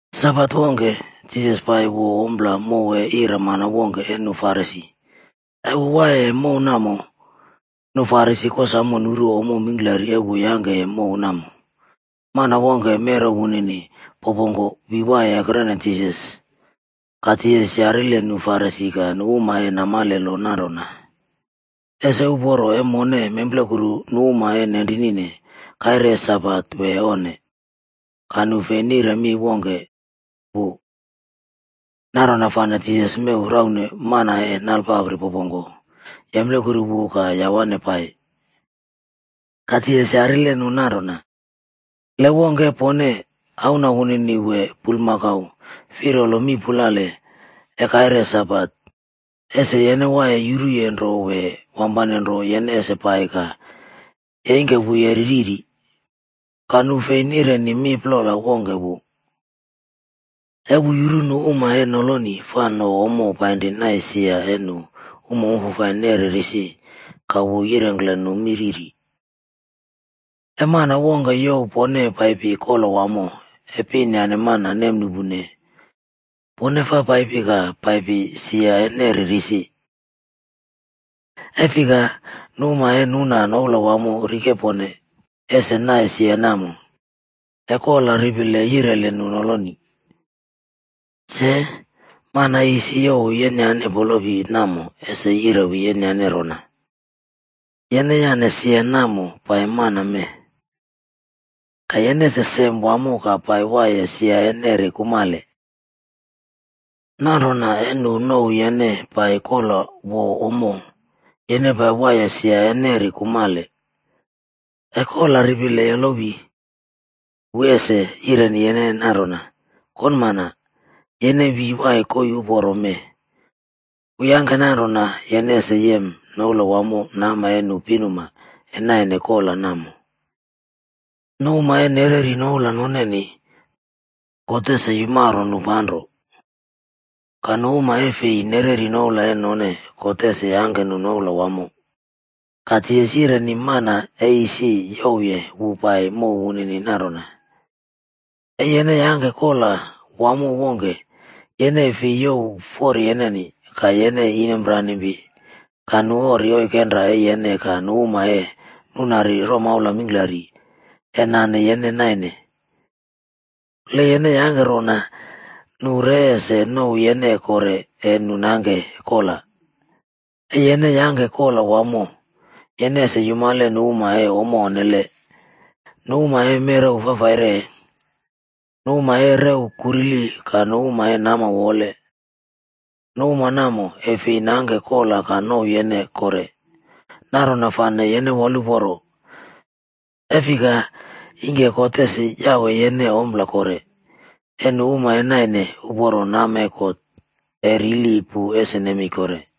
Sabat wongke, Jisas pai wo ompla mow e iramana wongke e nu Farisi. E wu waiye mow namo, nu farisi kosamo nuru ommo mingklari e wu yangkeye mow namo. Mana wongke merew wunini popongko wi waiye ekrene Jisas. Ka Jisas yarile nu Farisi ka nu uma e namale lo nanrona, “Ese uporo e mone memplekuru nu uma e nenrinine kaire e Sabat wee onne?” Ka nu fei nire mi wongke wu. Nanrona fane Jisas mew raune mana e nale papri popoku, yemplekuru wu ka yawane pai. Ka Jisas yarile nu nanrona “Le wongke e pone, auna wunini wee bulmakau firalo mii pulale e kaire Sabat, ese yene waiye yuruye nro wee wampane nro yene ese pai ka yeingke wu yeri riri?” Ka nu fi nireni mi plol wongke wu. E wu yuru nu uma e noloni fa no ommo painri naine sia e nu uma wamfafai neri risi ka wu yirengkle nu mi riri: “E mana wongke youw pone paipi kola wamo e pin yane mana nemnuꞌpune, pone fa paipi ka pai sia e neri risi. E fika, nu uma e nuna noula wamo rikepone pone ese nai sia namo, e kola ripile yireli nu noloni. Se, mana e isi youw yenyane polopipe namo ese yirewi yene rona, ‘Yene yane sia namo pai mana mee.’ Ka yene ese sem wamo ka pai waiye sia e neri kumale. Nanrona e nu nouw yene pai kola wo ommo, yene pai waiye sia e neri kumale, e kola ripile yolowi, wu ese yireni yene nanrona, ‘Konmana, yene wi wai koii uporo mee.’ Wu yangke nanrona yene ese yem noula wamo nama e nu pinuma e nainene kola namo. Nu uma e nereri noula noneni God ese yumaro nu panro. Ka nu uma e fei nereri noula e none God ese yangke nu noula wamo.” Ka Jisas yireni mana e isi youwye wu paiye mow wunini nanrona, “E yene yangke kola wamo wongke, yene e fei youw fori yeneni, ka yene inomranimpi ka nu ori oikenra e yene ka nu uma e nunari romaula mingklari e nane yene naine. Le yene yangke rona, nu re ese nouw yene kore e nu nangke kola. E yene yangke kola wamo, yene ese yumale nu uma e ommo onnele, nu uma e merew fafaire, nu uma e rew kurili ka nu uma e nama wowole. Nu uma namo e fei nangke kola ka nouw yene kore. Nanrona fane yene woluporo, e fika ingke God ese yawe yene ompla kore, e nu uma e naine uporo nama e God e rili pu ese nemei kore.”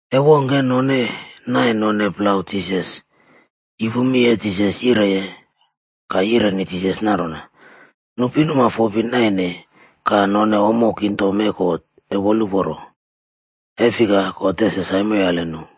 E wongke e none naine none plau Jisas, yupu mi e Jisas yireye, ka yireni Jisas nanrona, “Nu pinuma fopi naine ka none ommo kingdom e God e woluporo, e fika God ese saimoyale nu.”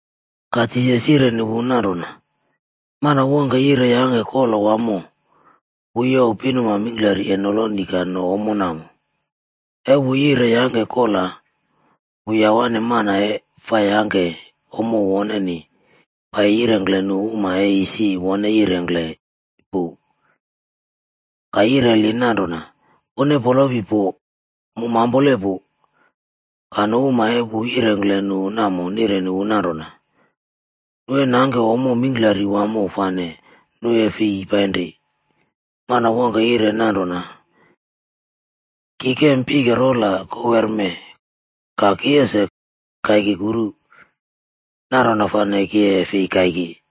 Ka Jisas yireni wu nanrona, “Mana wongke yire yangke kola wamo, wu youw pinuma mingklari e noloni ka no ommo namo. E wu yire yangke kola, wu yawane mana e fa yangke ommo woneni pai yirengkle nu uma e isi wone yirengkle pu. Ka yireli nanrona, ‘Pone polopi po, mu mampole pu.’ “Ka nu uma e wu yirengkle nu namo nireni wu nanrona, nu e nangke ommo mingklari wamo fane nu e fi painri. Mana wongke yire nanrona, ‘Ki kem pike rola kowerme ka ki ese kaiki kuru. Nanrona fane ki e fi kaiki.’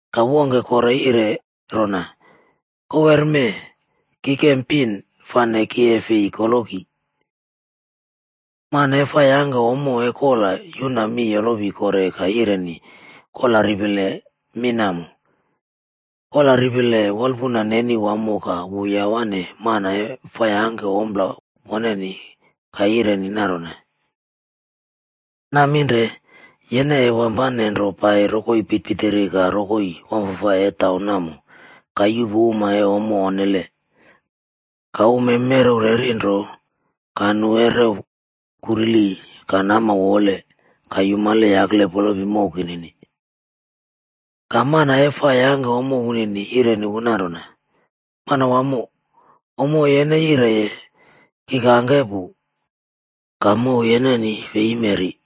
“Ka wongke kore yire rona, ‘Kowerme ki kem pin, fane ki e fi koloki.’ “Mana e fa yangke ommo e kola yuna mi yolowi kore ka yireni kola ripile mi namo. Kola ripile wolpuna neni wamo ka wu yawane mana e fa yangke ommo woneni ka yireni nanrona, ‘Naminre, yene e wampane nro pai rokoi pitirpitiri ka rokoi wamfafai e taun namo ka yuꞌpu uma e ommo onnele, ka uma e merew rerenro ka nu e rew kurili ka nama wowole, ka yumale yakle polopi mow kinini.’ “Ka mana e fa yangke ommo wunini yireni wu nanrona, ‘Manawamo, ommo e yene yireye, ki kangke pu, ka mow yeneni fei yimeri.’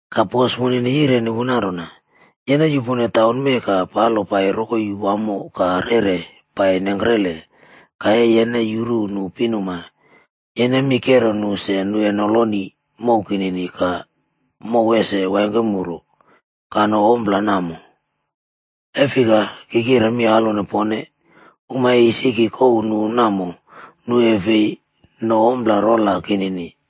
“Ka bos wunini yireni wu nanrona, ‘Yene yupone taun mee ka palo pai rokoi wamo ka rere pai nengkrele ka e yene yuru nu pinuma, yene mi kero nu se nu e noloni mow kinini ka mow ese waingkemuru ka no ommo namo. E fika, ki kire mi alwone pone, uma e isi ki kouw nu namo, nu e fi no ommo rola kinini.’”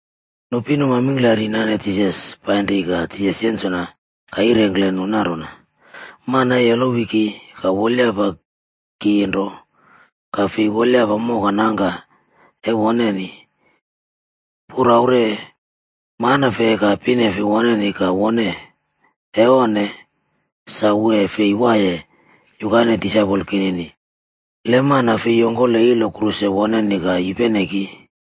Nu pinuma mingklari nane Jisas painri ka Jisas yensona ka yirengkle nu nanrona: Mana e yolowi ki ka wolyapa ki nro, ka fei wolyapa moka nangka e woneni, puraure, manefe ka pinefe woneni ka wone. E onne, sa wu e fi waiye yukaine disaipol kinini. Le mana fei yongkole ilo kruse woneni ka yupene ki,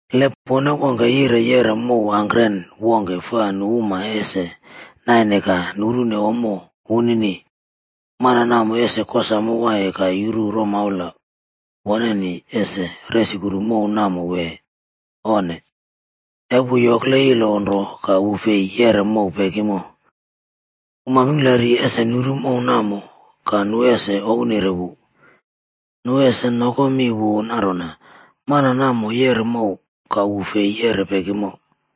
“Le pone wongke yire yeꞌre mow angkren wongke fa nu uma ese naine ka nurune ommo wunini, mana namo ese kosamo waiye ka yuru romaula woneni ese resukru mow namo wee, onne? E wu yokle ilo nro ka wu fei yeꞌre mow pekimo, uma mingklari ese nuru mow namo ka nu ese ouwnire wu. Nu ese nokomi wu nanrona, ‘Mana namo yeꞌre mow, ka wu fei yeꞌre pekimo.’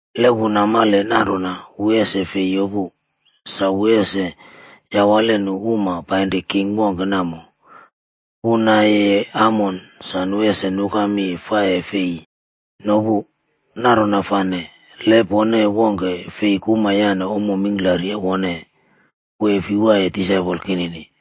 Le wu namale nanrona wu ese fei yopu, sa wu ese yawale nu uma painri king wongke namo, wu nayeye amon sa nu ese nuka mi fa e fei nopu. Nanrona fane, le pone wongke fei kuma yane ommo mingklari e wone, wu e fi waiye disaipol kinini.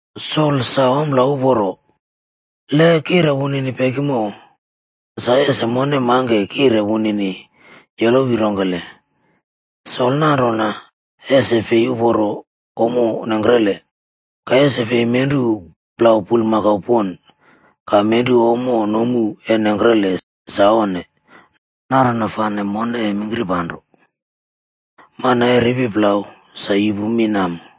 “Sol sa ompla uporo. Le kiꞌre wunini pekimo, sa ese mone mangke kire wunini yolowi rongkele? Solb nanrona ese fei uporo ommo nengkrele. Ka ese fei menru plau bulmakau pon, ka nenru ompla nomu e nengkrele sa onne. Nanrona fane mone e mingkirpanro. “Mana e ripi plau sa yupu mi namo.”